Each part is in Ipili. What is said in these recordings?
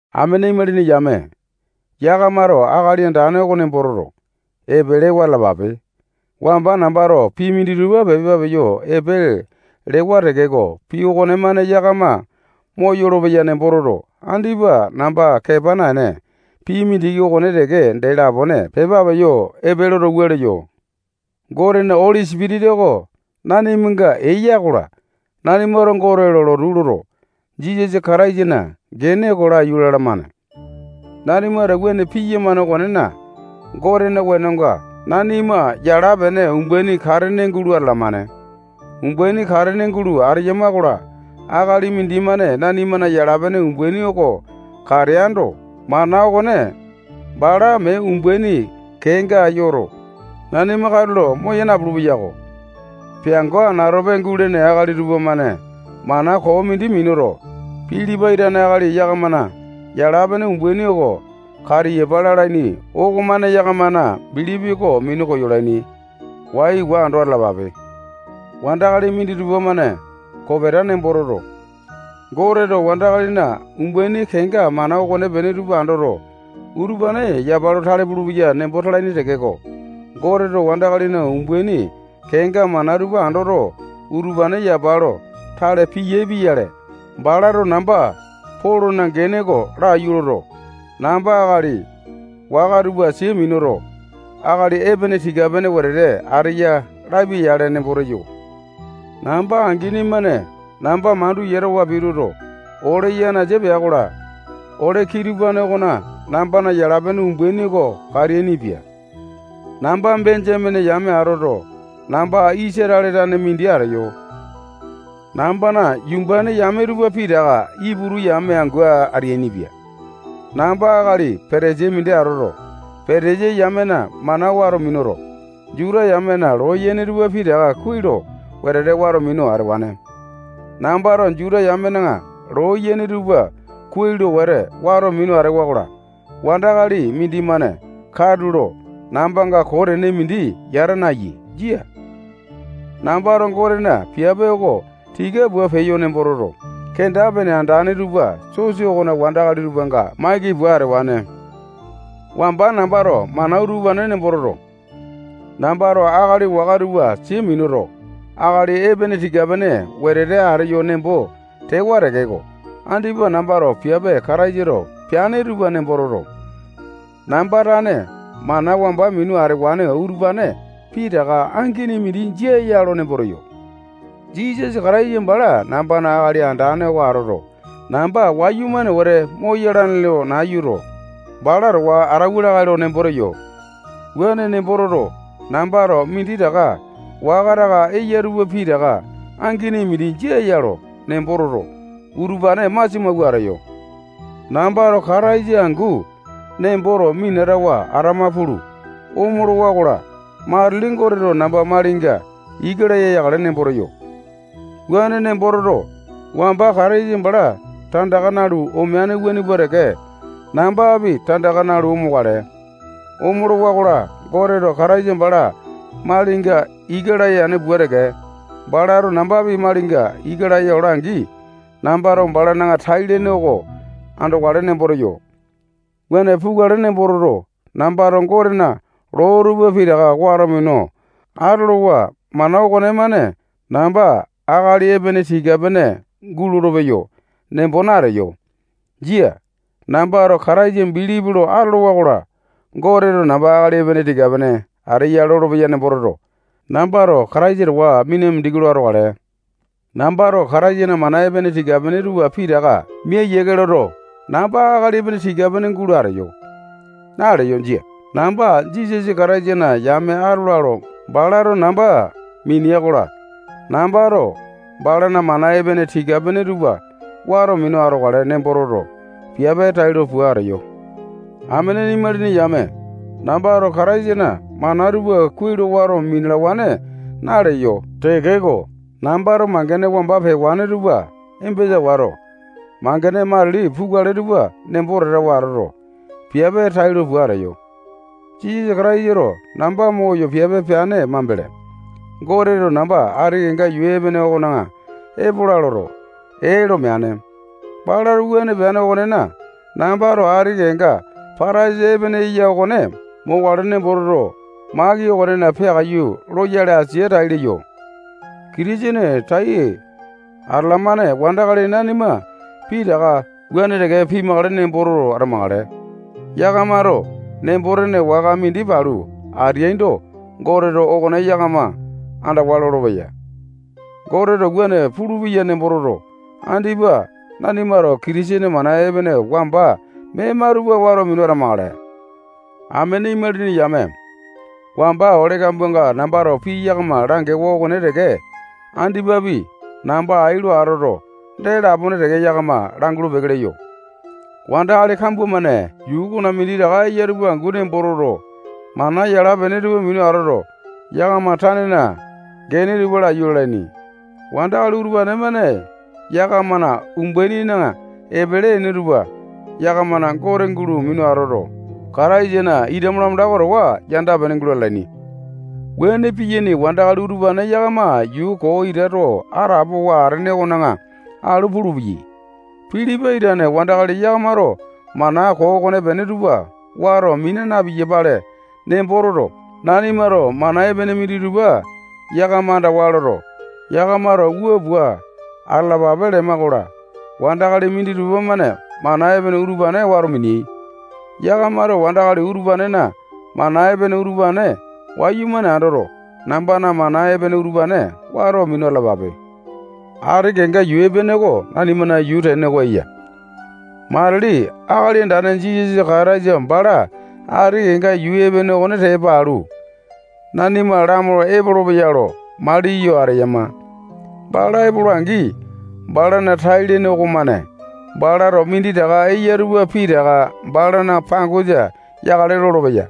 Amene imalini yame, yakamato Akali Andane oko nembo toto, epelewa atalapape. Wamba nambato pii minditupa pepa peyo epe lewa tekeko, pii okonemane yakama moyolo-peya nembo toto, andipa namba kepa naene, pii mindiki okone teke dee lapone pepa peyo epe loto, wua leyo: Gotena Oli Sipitisa oko nanimanga eya-kola, nanimato Gote lo lotu loto, Jisasa Kataisana gene oko laiyu lalamane. Nanimato wuane piyamane okonena, Gotena wenonga nanima yala-pene umbaini katene gulo atalamane. Umbaini katene gulo ateyama-kola, akali mindimane nanimana yala-pene umbaini oko kateaindo, mana okone bala mee umbaini kenga yoto, nanima katulo moya napulu-peyako. Peango anatope gulene akali tupamane mana koo mindi minuto, Pilipai tane akali yakamana yala-pene umbaini oko katiyapa lalaini okomane yakamana bilipi oko minu koyolaini. Waiwa ando atalapape. Wandakali minditupa-mane kopeta nembo toto, Goteto wandakalina umbaini kenga mana okonepene tupa andoto, utupane yapa lo tale pulupeya nembo talaini tekeko, Goteto wandakalina umbaini kenga mana tupa andoto, utupane yapa lo tale piyae pia-yale, balato namba Polona gene oko laiyu loto, namba akali waka tupa sia minuto, akali epene tika-pene wete ateya lapia-yale nembo teyo. Namba angini-mane namba mandu yatawa pituto, ole yanasa pea-kola, ole kitupane okona nambana yala-pene umbaini oko kateainipia. Namba Benjamene yame atoto, namba Isatale tane mindi ateyo. Nambana yumbane yame tupa pitaka Iputu yame angu ateainipia. Namba akali Patasai mindi atoto, Patasai yamena mana wato minuto, Juta yamena loo yene tupa pitaka kuai lo wete wato minu atewane. Nambato Juta yamena loo yene tupa kuai lo wete wato minu atewa-kola, wandakali mindimane katulo nambanga koo tene mindi yata nayaini. Jia. Nambato Gotena piape oko tika pua peyo nembo toto, kenda-pene andane tupa sosa okona wandakali tupanga maiki pua atewane. Wamba nambato mana utupane nembo toto, nambato akali waka tupa sia minuto, akali epene tika-pene wete ateyo nembo tewa tekeko, andipa nambato piape Kataisato peane tupa nembo toto, namba tane mana wamba minu atewa utupane pitaka angini mindi jia ya lo nembo teyo. Jisasa Kataisa bala nambana Akali Andane oko atoto, namba wayumane wete moyalane lo nayuto, bala towa atauwa lakae lo nembo teyo. Wuane nembo toto, nambato minditaka waka taka eya tupa pitaka angini mindi jia ya lo nembo toto, utupane masia mawua ateyo. Nambato Kataisa angu nemboto minatawa atama pulu, omolawa-kola, matili Goteto namba malinga ika laya yakale nembo teyo. Wuane nembo toto, wamba Kataisa bala tandaka nalu omeane wuane pua teke, nambapi tandaka nalu omokale. Omolowa-kola, Goteto Kataisa bala malinga ika laya yane pua teke, balato nambapi malinga ika laya ola-angi, nambato balana tai-lene oko andokale nembo teyo. Wuane pukale nembo toto, nambato Gotena loo tupa pitaka wato minu atolowa mana okonemane namba akali epene tika-pene gulolo-peyo nembo nateyo. Jia. Nambato Kataisa bilipi lo atolowa-kola, Goteto namba akali epene tika-pene ateya lolopeya nembo toto, nambato Kataisa towa mina mindiki lo atokale. Nambato Kataisana mana epene tika-pene tupa pitaka mia yiake loto, namba akali epene tika-pene gulo ateyo naleyo. Jia. Namba Jisasa Kataisana yame atola lo balato namba minea-kola, nambato balana mana epene tika-pene tupa wato minu atokale nembo toto, piape tailo pua ateyo. Amene imalini yame, nambato Kataisana mana tupa kuai lo wato minalawane naleyo tekeko, nambato mangene wamba pewane tupa embesa wato, mangene matili pukale tupa nembo tatawa atoto, piape tailo pua ateyo. Jisasa Kataisato namba moyo piape peane mambele, Goteto namba ati kenga yuu epene okona epola loto, ee lo meane. Balato wuane peane okonena, nambato ati kenga pataisa epene eya okone mokale nembo toto, maki okonena peakaiyu loyale asia tai leyo. Kitisene tai atalamane wandakali nanima pitaka wuane teke pimakale nemboto atamakale. Yakamato nembo-tene waka mindi palu ateaindo, Goteto okone yakama andawa lolopeya. Goteto wuane pulupeya nembo toto, andipa nanimato Kitisene mana epene wamba mema tupa wato minu atamakale. Amene imalini yame, wamba ole kambuanga nambato pii yakama langewa okone teke andipapi namba ai lo atoto, dee lapone teke yakama langulu-peke leyo. Wandakali kambua-mane yuu okona minditaka eya tupa angu nembo toto, mana yala-pene tupa minu atoto, yakama tanena gene tupa laiyu lalaini. Wandakali utupane-mane yakamana umbainina epele ene tupa yakamana gote gulo minu atoto, Kataisana ita malamanda oko towa yanda-pene gulo atalaini. Wuane piyaini wandakali utupane yakama yuu koo ita too atapowa atene okona alu pulupeyai. Pilipai tane wandakali yakamato mana koo okonepene tupa wato mina na-piyapale nembo toto, nanimato mana epene minditupa yakama andawa loto, yakamato wua pua atalapape lema-kola, wandakali minditupa-mane mana epene utupane wato mineai. Yakamato wandakali utupanena mana epene utupane wayumane andoto, nambana mana epene utupane wato minu atalapape. Ati kenga yuu epene oko nanimana yuu tene oko eya. Matili Akali Andane Jisasa Kataisa bala ati kenga yuu epene okone tepa alu, nanima lamolo epolopeya lo maliyo ateyama. Bala epola-angi, balana tai-lene okomane balato minditaka eya tupa pitaka balana pangosa yakale lolopeya.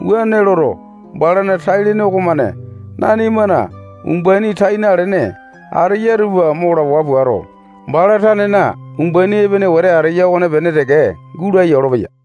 Wuane loto, balana tai-lene okomane nanimana umbaini tai nalene ateya tupa mo lawua puato, bala tanena umbaini epene wete ateya okonepene teke gulaya olopeya.